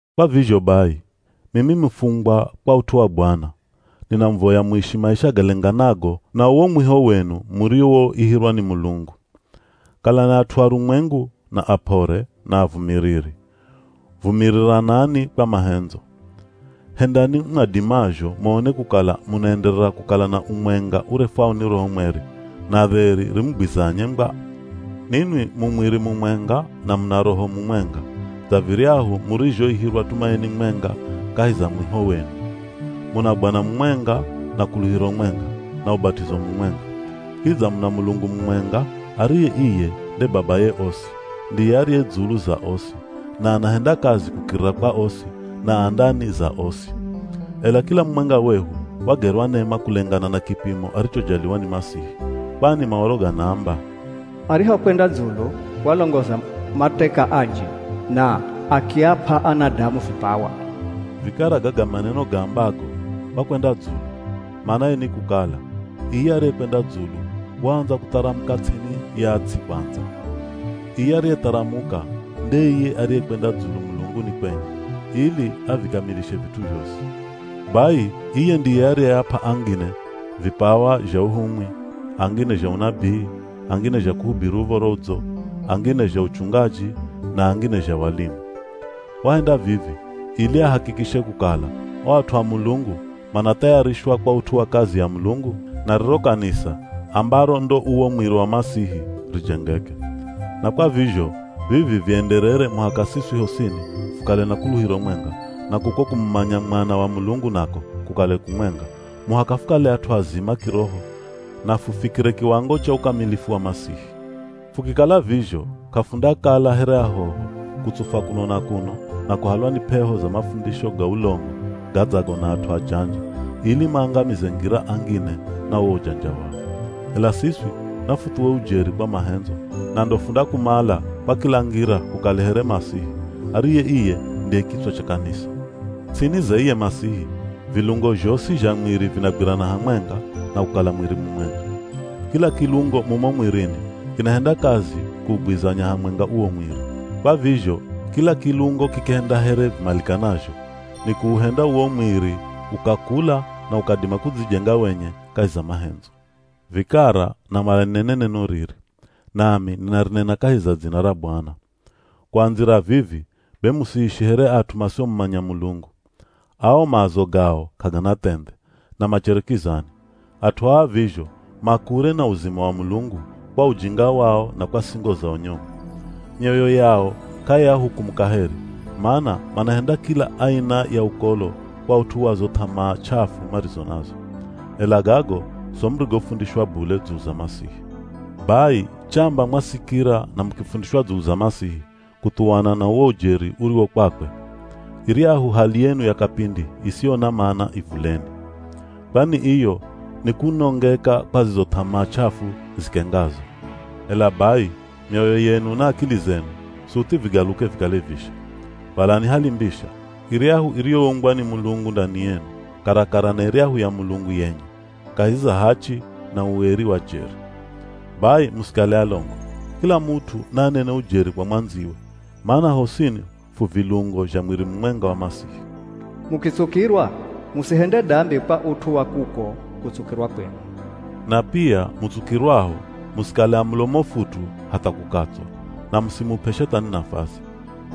Kwa vizho bai, mimi mufungwa kwa ut'u wa Bwana, ninamuvoya muishi maisha galenganago na uwo mwiho wenu muriwoihirwa ni Mulungu. Kalani at'u arumwengu, na ap'ore, na avumiriri. Vumiriranani kwa mahendzo. Hendani mwadimazho muone kukala munaenderera kukala na umwenga urefwao ni Roho Mweri, na dheri rimugwizanye ngwa. Ninwi mu mwiri mumwenga na muna Roho mumwenga, dza viryahu murizhoihirwa tumaini mwenga kahi za mwiho wenu. Muna Bwana mumwenga, na kuluhiro mwenga, na ubat'izo mumwenga. Kidza muna Mulungu mumwenga, ariye iye nde Babaye osi, ndiye ariye dzulu za osi, na anahenda kazi kukirira kwa osi, na a ndani za osi. Ela, kila mumwenga wehu wagerwa nema kulengana na kipimo arichojaliwa ni Masihi. Kwani Maoro ganaamba, “Arihokwenda dzulu walongoza mateka anji, na akiap'a anadamu vipawa.” Vikara gaga maneno gaambago, “Wakwenda dzulu” manaye ni kukala, iye ariyekwenda dzulu waandza kutharamuka ts'ini ya ts'i kwandza. Iye ariyetharamuka, nde iye ariyekwenda dzulu mulunguni kwenye, ili avikamilishe vit'u zhosi. Bai iye ndiye ariyeap'a angine, vipawa zha uhumwi, angine zha unabii, angine zha kuhubiri Uv̱oro Udzo, angine zha uchungaji na angine zha walimu. Wahenda vivi, ili ahakikishe kukala, o at'u a Mulungu manathayarishwa kwa ut'u wa kazi ya Mulungu, na riro kanisa, ambaro ndo uwo mwiri wa Masihi, rijengeke. Na kwa vizho, vivi vienderere muhaka siswi hosini fukale na kuluhiro mwenga, na kuko kumumanya Mwana wa Mulungu nako kukale kumwenga, muhaka fukale at'u azima kiroho na fufikire kiwango cha ukamilifu wa Masihi. Fukikala vizho, k'afundakala here ahoho, kutsufwa kuno na kuno, na kuhalwa ni p'eho za mafundisho ga ulongo gadzago na at'u ajanja, ili maangamize ngira angine na uwo ujanja wao. Ela siswi, nafuthuwe ujeri kwa mahendzo, na ndo fundakumala kwa kila ngira hukale here Masihi, ariye iye ndiye kitswa cha kanisa. Ts'ini za iye Masihi, vilungo zhosi zha mwiri vinagwirana hamwenga na kukala mwiri mumwenga. Kila kilungo mumo mwirini kinahenda kazi kuugwizanya hamwenga uwo mwiri. Kwa vizho kila kilungo kikihenda here vimalikanazho, nikuuhenda uwo mwiri ukakula na ukadima kudzijenga wenye kahi za mahendzo. Vikara namala ninene neno riri, nami ninarinena kahi za dzina ra Bwana; kuandzira vivi, be musiishi here at'u masiomumanya Mulungu. Ao maazo gao k'agana thendhe, na machere kizani. At'u aa vizho, ma kure na uzima wa Mulungu kwa ujinga wao na kwa singo zao nyomu. Myoyo yao k'aiahukumu kaheri, mana manahenda kila aina ya ukolo kwa ut'u wa zo th'amaa ch'afu marizo nazo. Ela gago so murigofundishwa bule dzulu za Masihi! Bai chamba mwasikira na mukifundishwa dzulu za Masihi, kuthuwana na uwo ujeri uriwo kwakwe, iryahu hali yenu ya kapindi isiyo na mana ivuleni. Kwani iyo nikunongeka kwa zizo th'amaa ch'afu zikengazo. Ela bai mioyo yenu na akili zenu suthi vigaluke vikale visha. Valani hali mbisha, iryahu iriyoumbwa ni Mulungu ndani yenu, karakara na iryahu ya Mulungu yenye, kahi za hachi na ueri wa jeri. Bai musikale alongo, kila mut'u naanene ujeri kwa mwandziwe, mana hosini fu vilungo zha mwiri mumwenga wa Masihi. Mukitsukirwa, musihende dambi kwa ut'u wa kuko kutsukirwa kwenu. Na pia mutsukirwaho, musikale a mulomo futu hatha kukatswa, na musimup'e Shethani nafasi.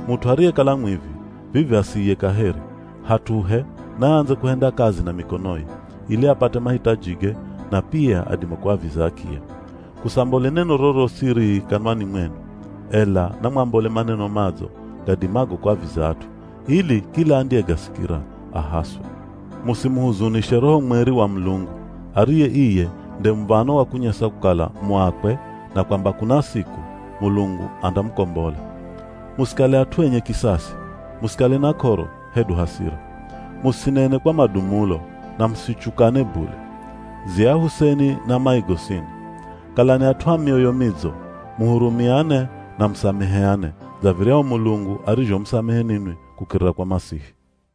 Mut'u ariyekala mwivi, vivi asiiye kaheri, hat'uhe naandze kuhenda kazi na mikonoye, ili apate mahitajige na pia adime kuaviza akiya. Kusambole neno rorosi rii kanwani mwenu, ela namwambole maneno madzo gadimago kuaviza at'u, ili kila andiyegasikira, ahaswe. Musimuhuzunishe Roho Mweri wa Mulungu, ariye iye nde muv̱ano wa kunyesa kukala mu akwe na kwamba kuna siku, Mulungu andamukombola. Musikale at'u enye kisasi, musikale na k'oro, hedu hasira. Musinene kwa madumulo, na musichukane bule. Dziahuseni na mai gosini. Kalani at'u a mioyo midzo, muhurumiane, na musameheane dza viryahu Mulungu arizhomusamehe ninwi kukirira kwa Masihi.